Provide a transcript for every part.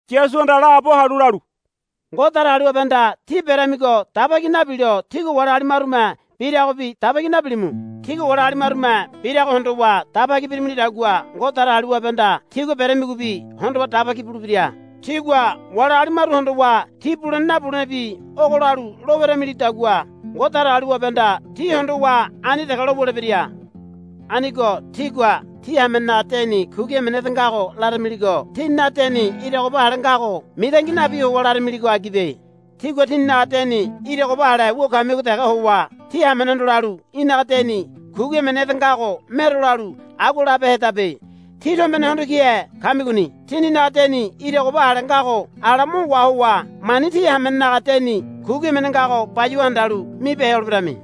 Yasuhanda laabo halu lalu, Ngode Datagaliwabehanda tí beramigo daba ki nabilo tígua wali agali marume biragobi daba ki nabilimu. Tígua wali agali marume birago hondowa daba ki beramilidagua Ngode Datagaliwabehanda tígua beramigobi hondowa daba ki bulebira. Tígua wali agali maru hondowa ti bulene nabulene bi ogo lalu lo weramilidagua Ngode Datagaliwabehanda tí hondowa ani dege lo wulebira. Anigo tígua tí hamenenaga deni kugi emene ede ngago laramiligo tíninaga deni ira goba ale ngago mitangi nabi howa laramiligo agibe. Tígua tíninaga deni ira goba ale wu kamigo dege howa tí hamenehondo lalu, Í̠naga deni kugi emene ede ngago mero, lalu agua labehedabe. Tí tombene hondo kihe kamigoni. Tíninaga deni ira goba ale ngago ala mo wahowa mani tí hamenenaga deni kugi emene ngago bayuwa handalu mibehe holeberami.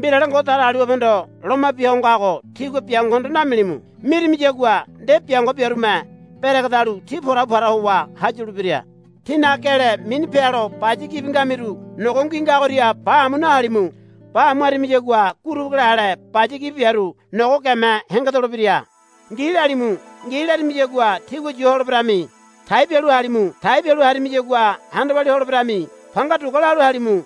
Mbirale Ngode Datagaliwabehondo loma bia ho ngago tígua biangohondo namilimu. Mirimiyagua nde biango biarume beregedalu tí porabu para howa hayulebira. Tínaga gele mini pealo baya gibi ngamiru nogo ngui ngagoria ba amu nahalimu. Ba amu harimiyagua gurubu gele ale baya gibi biaru nogo geme hengedolebira. Ngi, lalimu. Ngi, larimiyagua tígua yu holeberami. Tai bialu halimu. Tai bialu harimiyagua handa walia holeberami. Panga dugua, lalu halimu.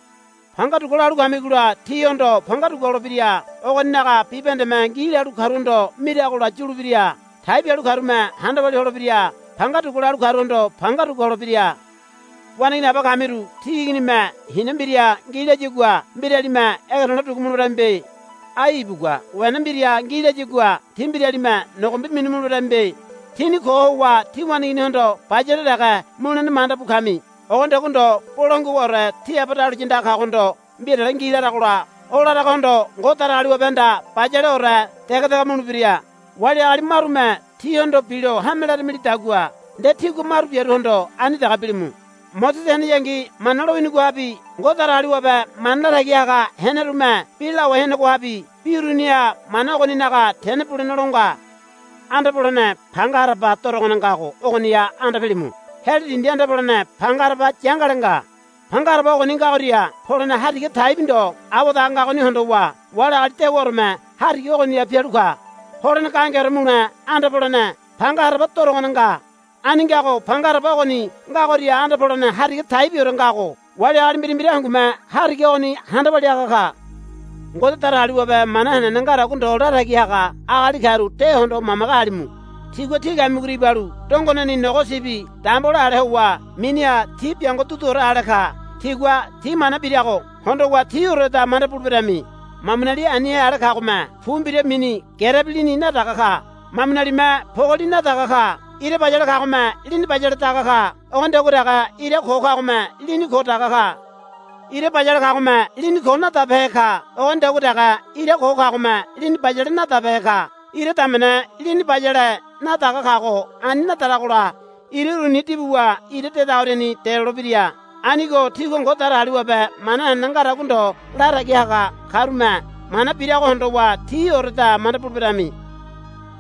Panga dugua, lalu kamigola tíhondo panga dugua holebira. Ogoninaga bibahendeme, Ngi, lalu karuhondo miragola yulebira. Tai bialu karume handa walia holebira. Panga dugua, lalu karuhondo panga dugua holebira. Waneigini aba kamiru tí iginime, Hina mbira ngi, layagua mbiralime ege to̱le̱ dugu muleberamibe. Ai ibugua, Wena mbira ngi, layagua tí mbiralime nogombi minu muleberamibe. Tíni ko howa tí waneiginihondo bayale dege mulene manda bu kami. Ogonidagua ndo bolangua howaore tí Aba dahuliya andaga kagohondo mbirale ngi laragola o laragohondo Ngode Datagaliwabehanda bayaleore dege dege mulebira. Wali agali marume tíhondo bilo hame laramilidagua nde tígua maru biaruhondo ani dege bilimu. Mosese heneyangi Mana lowinigohabi Ngode Datagaliwabe mana latagi haga henerume bi lawai henegohabi bi uruniha mana ogoninaga tene bulene lo nga. Anda polene panga haraba dorogone ngago ogoniha anda pilimu. Heli dindi anda polene panga haraba yangale nga. Panga haraba ogoni ngagoria polene hariga taibi ndo awadaga ngagoni hondowa wali agali dewaoreme hariga ogoriani pialu ka. Holene gahengeore mule anda polene panga haraba dorogone nga. Ani ngago panga haraba ogoni ngagoria anda polene hariga taibiore ngago wali agali mbira mbira hangume hariga ogoni handa walia haga ka. Ngode Datagaliwabe mana henene ngadagua ndo latagi haga agali karu de hondowa mamage halimu. Tigua tí kamigoria ibalu dongoneni nogo sibi dambole ale howa miniha ti biango duduore ale ka. Tígua ti mana birago hondowa tioreda manda buleberami. Mamunali anihe ale kagome pu mbira mini gerebi lini nadaga ka. Mamunalime pogoli nadaga ka. Ira bayale kagome lini bayale daga ka. Ogonidagua dege ira ko kagome lini ko daga ka. Ira bayale kagome lini ko nadabehe ka. Ogonidagua dege ira ko kagome lini bayale nadabehe ka. Ira damene lini bayale nadaga kago ani nadaragola ira uruni dibuwa ira dedagoriani delolebira. Anigo tígua Ngode Datagaliwabe mana henene ngadagua ndo latagi haga karume mana birago hondowa tioreda manda buleberami.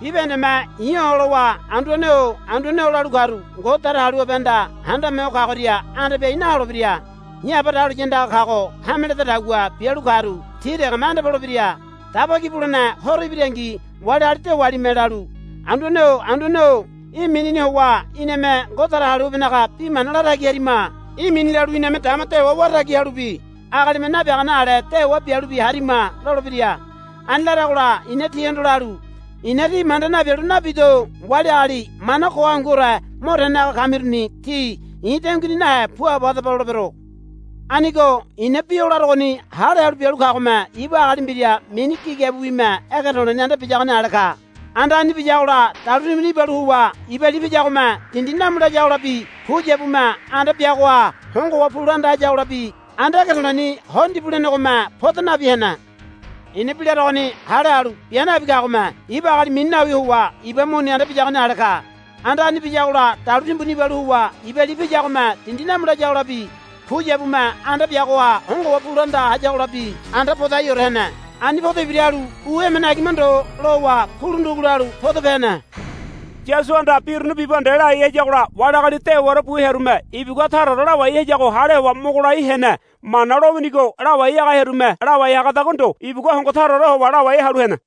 Bibahendeme i̱ olowa, Anduane-o Anduane-o, lalu karu Ngode Datagaliwabehanda Handame Ho Kagoria anda piai naholebira. I̱ Aba dahuliya andaga kago hame ledadagua bialu karu ti degeme anda polebira. Daba Ki Bulene Horo ibirangi wali agali dewalime lalu, Anduane-o Anduane-o í̠ minini howa iname Ngode Datagaliwabenaga bi mana latagi harima. Í̠ mini lalu iname dama dewa wara tagi halubi agalime nabiagane ale dewa bialubi harima, lolebira. Ani laragola i̱na tihondo lalu, I̱na tí manda nabialu nabido. Wali agali mana ko hanguore mo tene haga kamiruni tí i̱ denguini nahe puabo hadaba, lolebero. Anigo i̱na bi o larogoni hale halu bialu kagome ibu agali mbira mini gigabiwime ege to̱le̱ni anda biyagoni ale ka. Anda ani biyagola dalu timbuni ibalu howa iba li piyagome dindi namu layagolabi puyabume anda biagoha hongo howa pu la anda hayagolabi anda ege to̱le̱ni ho ndibu lenegome poda nabi hene. I̱na bi larogoni hale halu bia nabi kagome ibu agali mini nawi howa iba muni anda biyagoni ale ka. Anda ani biyagola dalu timbuni ibalu howa iba li piyagome dindi namu layagolabi puyabume anda biagoha hongo howa pu la anda hayagolabi anda podaiore hene. Ani podo ibira halu u emene agima ndo lowa kulu ndugu lalu podope hene. Yasuhanda bi uruni bibahende lai hayagola wali agali dewaore bu hearume ibugua taraore lawai hayago hale howa mogo lai hene. Mana lowinigo lawai haga hearume lawai hagadagua ndo ibugua hongo taraore howa lawai halu hene.